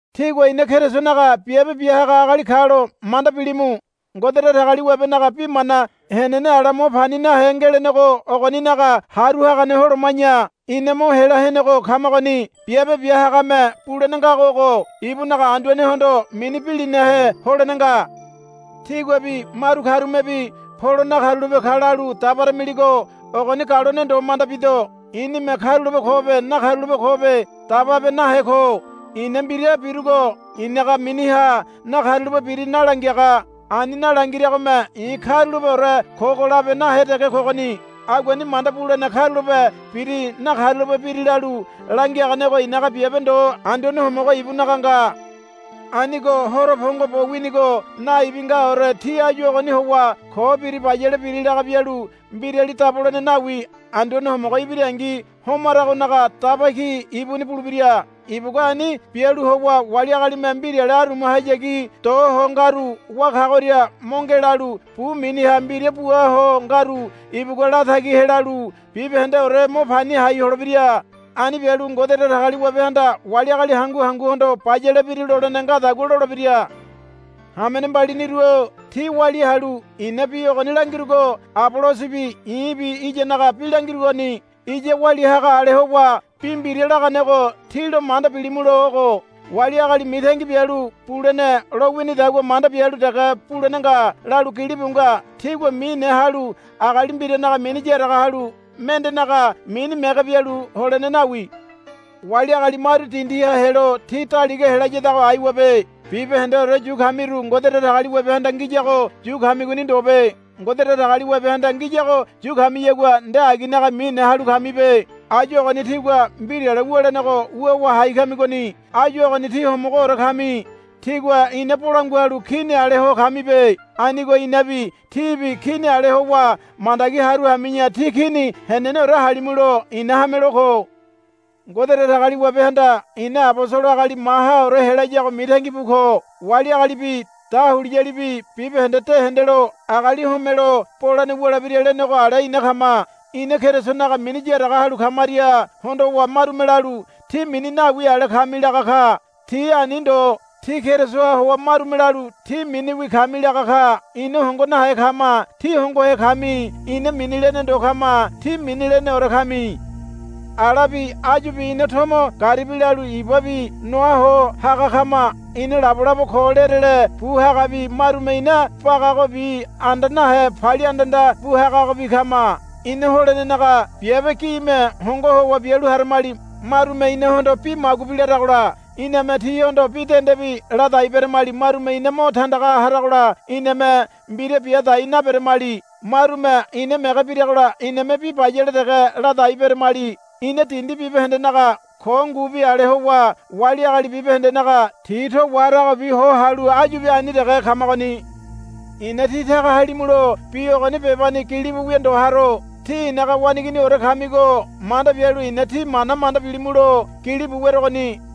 Tígua ina Kerisonaga biabe bia haga agali kalo manda bilimu. Ngode Datagaliwabenaga bi mana henene ala mo pani nahe ngelenego ogoninaga haru hagane holoma̱ya ina mo hela henego kamagoni. Biabe bia hagame bulene ngago ogo. Ibunaga Anduanehondo mini bilinahe holene nga. Tíguabi maru karumebi, Polo nakarulape ka, lalu dabaramiligo ogoni galone ndo manda bido. I̱nime karulape kobe nakarulape kobe dababe nahe ko. I̱na mbira birugo i̱naga miniha nakarulape biri nalangiaga. Ani nalangiragome i̱ karulapeore kogo labe nahe dege kogoni. Aguani manda bulene karulape biri nakarulape biri lalu langiaganego i̱naga biabe ndo Anduane Homogo ibunaga nga. Anigo horo pongo bo winigo naibi ngaore tí áyu ogoni howa ko biri bayale biri laga bialu mbirali dabolene nawi. Anduane Homogo ibirangi hamaronaga daba ki ibuni bulebira. Ibugua ani bialu howa wali agalime mbirale arumahayagi do ho ngaru wá kagoria mo ngelalu bu miniha mbira bua ho ngaru ibugua latagi helalu bibahendeore mo pani hai holebira. Ani bialu Ngode Datagaliwabehanda wali agali hangu hanguhondo, Bayale biri, lolene ngadagua lolebira. Hamene mbaliniru-o tí walia halu i̱na bi ogoni langirugo Abolosobi i̱bi iyanaga bi langirugoni. Iya walia haga ale howa bi mbira laganego tí lo manda bilimulo ogo, Wali agali mitangi bialu bulene lo winidagua manda bialu dege bulene nga, lalu gilibu nga. Tígua mine halu agali mbiranaga mini yaraga halu mendenaga mini mege bialu holene nawi. Wali agali maru dindiha helo tí daliga helayadago aiwabe. Bibahendeore yu kamiru Ngode Datagaliwabehanda ngiyago yu kamigoni ndobe. Ngode Datagaliwabehanda ngiyago yu kamiyagua nde aginaga mine halu kamibe. Áyu ogoni tígua mbirale wulenego wuwa hai kamigoni. Áyu ogoni tí homogoore kami. Tígua ina bolangua halu kini ale ho kamibe. Anigo inabi tíbi kini ale howa mandagi haru hami̱ya tí kini heneneore halimulo i̱na hamelo ko. Ngode Datagaliwabehanda ina abosolo agali mahaore helayago mitangi bu ko. Wali agalibi dahuliyalibi bibahende de hendelo agali homelo bolene wulebira lenego ale ina kama. Ina Kerisonaga mini yaraga halu kamaria hondowa marume lalu, Tí mini nawi ale kami, laga ka. Tí ani ndo. Tí Kerisoha howa marume lalu, Tí miniwi kami, laga ka. Ina hongo nahe kama. Tí hongohe kami. Ina mini lene ndo kama. Tí mini leneore kami. Alabi áyubi ina tomo garibi lalu ibabi noa ho haga kama. Ina labolabo ko lerele bu hagabi marume ina bagagobi anda nahe palia andanda bu hagabi kama. Ina holenenaga biabe gime hongo howa bialu haramali. Marume inahondo bi magubi laragola iname tihondo bi dendebi ladai beramali. Marume ina mo tandaga haragola iname mbira bia dai naberamali. Marume ina mege biragola iname bi bayale dege ladai beramali. Ina dindi bibahendenaga ko ngubi ale howa wali agali bibahendenaga ti to waharagobi ho halu áyubi ani dege kamagoni. I̱na tí taga halimulo bi ogoni bebani gilibu wia ndo haro. Tí i̱naga waneiginiore kamigo manda bialu i̱na tí mana manda bilimulo gilibu werogoni.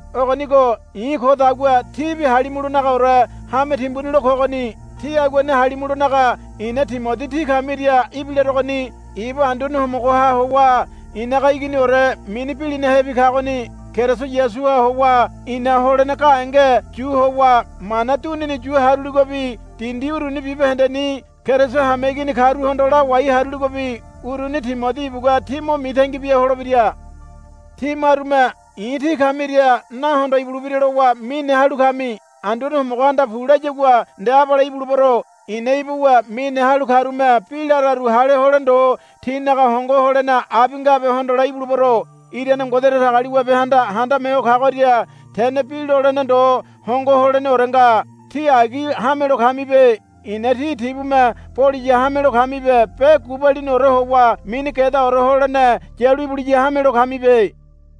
Ogonigo i̱ kodagua tíbi halimulonagaore hame timbuni lo kogoni. Tí aguani halimulonaga i̱na Timodi tí kamiria ibilarogoni. Ibu Anduane Homogoha howa i̱naga iginiore mini bilinahebi kagoni. Keriso Yasuha howa i̱na holene gahenge yu howa mana dunini yu haruligobi dindi uruni bibahendeni Keriso hameigini karuhondo lawai haruligobi uruni Timodi ibugua tí mo mitangi bia holebira. Tí marume i̱ tí kamiria nahondo ibulebira lowa mine halu kami. Anduane Homogohanda pu layagua nde abale ibulebero. I̱na ibuwa mine halu karume bi lararu hale hole ndo tinaga hongo holene abi ngabe hondole ibulebero. Irane Ngode Datagaliwabehanda Handame Ho Kagoria tene bi lolene ndo hongo holeneore nga. Tí agi hamelo kamibe. I̱na tí tibume boliya hamelo kamibe be gubaliniore howa mini gedaore holene yalu ibuliya hamelo kamibe.